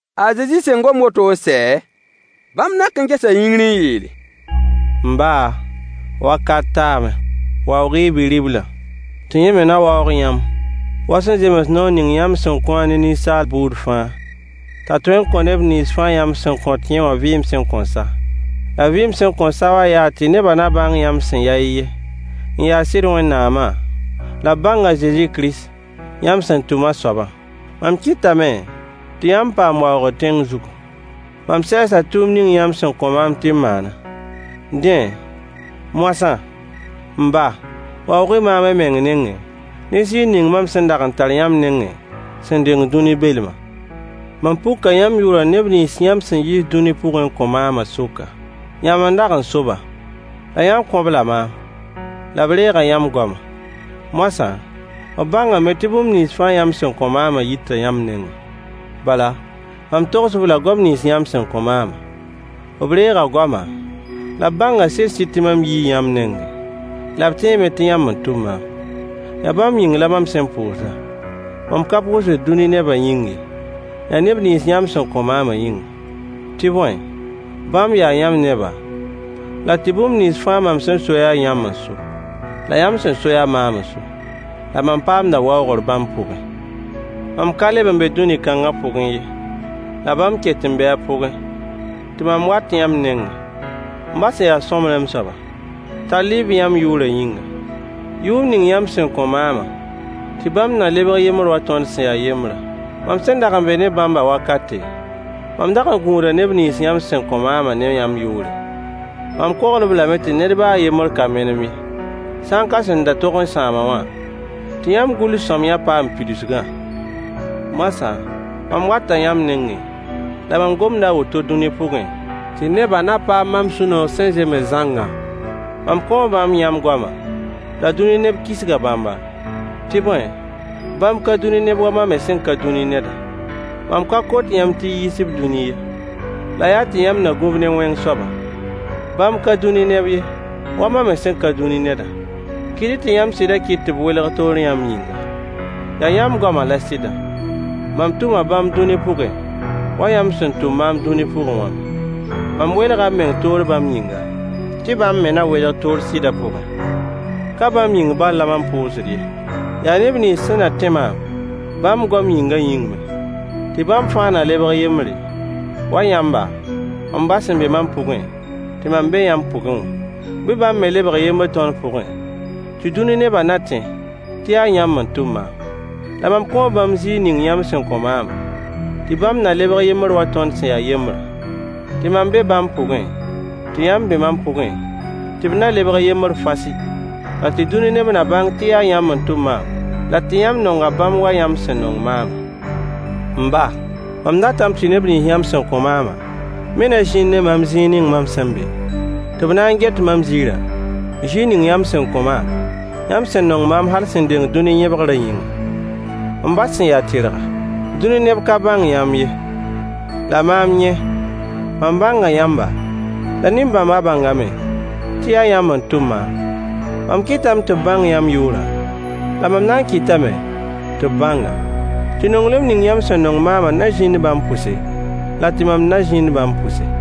A Zezi sẽn gom woto n sɛ, bãmb nak n gesa yĩngr n yeele: M ba, wakat taame. Waoog-y y bi-riblã, tɩ yẽ me na waoog yãmb wa sẽn zems noor ning yãmb sẽn kõ-a ne Ninsaal buud fãa, t'a tõe n kõ neb nins fãa yãmb sẽn kõ yẽ wã vɩɩm sẽn kõn sa. La vɩɩm sẽn kõn sa wã yaa tɩ nebã na bãng yãmb sẽn ya y yen, n ya sɩd Wẽnnaamã, la b bãng a Zezi Kirist, yãmb sẽn tʋm a soabã. Mam kɩtame tɩ yãmb paam waoogr tẽng zugu. Mam sɛɛsa tʋʋmd ning yãmb sẽn kõ maam tɩ m maanã. Dẽ, moasã, m ba, waoog-y maam y meng nengẽ ne ziir ning mam sẽn dag n tar yãmb nengẽ sẽn deng dũni belmã. Mam puka yãmb yʋʋrã neb nins yãmb sẽn yiis dũni pʋgẽ n kõ maamã sʋka. Yãmb n dag n so-ba, la yãmb kõ-b-la maam, la b reega yãmb goamã. Moasã, b bãngame tɩ bũmb nins fãa yãmb sẽn kõ maamã yita yãmb nengẽ. Bala, mam togs-b-la goam nins yãmb sẽn kõ maamã. B reega goamã, la b bãnga sɩd-sɩd tɩ mam yii yãmb nengẽ, la b tẽeme tɩ yãmb n tʋm maam. Yaa bãmb yĩng la mam sẽn pʋʋsdã. Mam ka pʋʋsd dũni nebã yĩng ye, yaa neb nins yãmb sẽn kõ maamã yĩnga, tɩ bõe, bãmb yaa yãmb neba la tɩ bũmb nins fãa mam sẽn so yaa yãmb n so, la yãmb sẽn so yaa maam n so. La mam paamda waoogr bãmb pʋgẽ. Mam ka leb n be dũni kãngã pʋgẽ ye, la bãmb ket n bee a pʋgẽ, tɩ mam wat yãmb nengẽ. M ba sẽn ya sõmblem soaba, tall-y-b yãmb yʋʋrã yĩnga, yʋʋr ning yãmb sẽn kõ maamã, tɩ bãmb na lebg yembr wa tõnd sẽn ya yembrã. Mam sẽn dag n be ne bãmbã wakate, mam dag n gũuda neb nins yãmb sẽn kõ maamã ne yãmb yʋʋre. Mam kogl-b lame tɩ ned baa a yembr ka menem ye, sã n ka sẽn da tog n sãam-a wã, Yaa a Zudas Iskaryo yell la b sẽn goma. tɩ yãmb gʋls-sõamyã paam pidsgã. Moasã, mam wata yãmb nengẽ, la mam gomda a woto dũni pʋgẽ, tɩ nebã na paam mam sũ-noog sẽn zems zãngã. Mam kõo bãmb yãmb goamã, la dũni neb kisga bãmba, tɩ bõe, bãmb ka dũni neb wa mam me sẽn ka dũni nedã. Mam ka kot yãmb tɩ y yiis-b dũni ye, la yaa tɩ yãmb na gũ-b ne wẽng soabã. Bãmb ka dũni neb ye, wa mam me sẽn ka dũni nedã. Kɩt-y tɩ yãmb sɩdã kɩt tɩ b welg toor yãmb yĩnga. Yaa yãmb goamã la sɩdã. Mam tʋma bãmb dũni pʋgẽ wa yãmb sẽn tʋm maam dũni pʋgẽ wã me. Mam welga m meng toor bãmb yĩnga, tɩ bãmb me na welg toor sɩdã pʋgẽ. Ka bãmb yĩng bal la mam pʋʋsd ye. Yaa neb nins sẽn na tẽ maam bãmb goam yĩngã yĩng me, tɩ bãmb fãa na lebg yembre, wa yãmba, m ba sẽn be mam pʋgẽ, tɩ mam be yãmb pʋgẽ wã. Bɩ bãmb me lebg yembr tõnd pʋgẽ, tɩ dũni nebã na tẽ tɩ yaa yãmb n tʋm maam. La mam kõo bãmb ziir ning yãmb sẽn kõ maamã, tɩ bãmb na lebg yembr wa tõnd sẽn ya yembrã, tɩ mam be bãmb pʋgẽ, tɩ yãmb be mam pʋgẽ, tɩ b na lebg yembr fasɩ, la tɩ dũni neb na bãng tɩ yaa yãmb n tʋm maam, la tɩ yãmb nonga bãmb wa yãmb sẽn nong maamã. M ba, mam datame tɩ neb nins yãmb sẽn kõ maamã me na zĩnd ne maam zĩig ning mam sẽn be, tɩ b na get mam ziirã, ziir ning yãmb sẽn kõ maam, yãmb sẽn nong maam hal sẽn deng dũni yẽbgrã yĩnga. M ba sẽn ya tɩrga, dũni neb ka bãng yãmb ye, la maam yẽ, mam bãnga yãmba, la nin-bãmba bãngame tɩ yaa yãmb n tʋm maam. Mam kɩtame tɩ b bãng yãmb yʋʋrã, la mam na n kɩtame tɩ b bãng-a, tɩ nonglem ning yãmb sẽn nong maamã na zĩnd bãmb pʋse, la tɩ mam na zĩnd bãmb pʋse.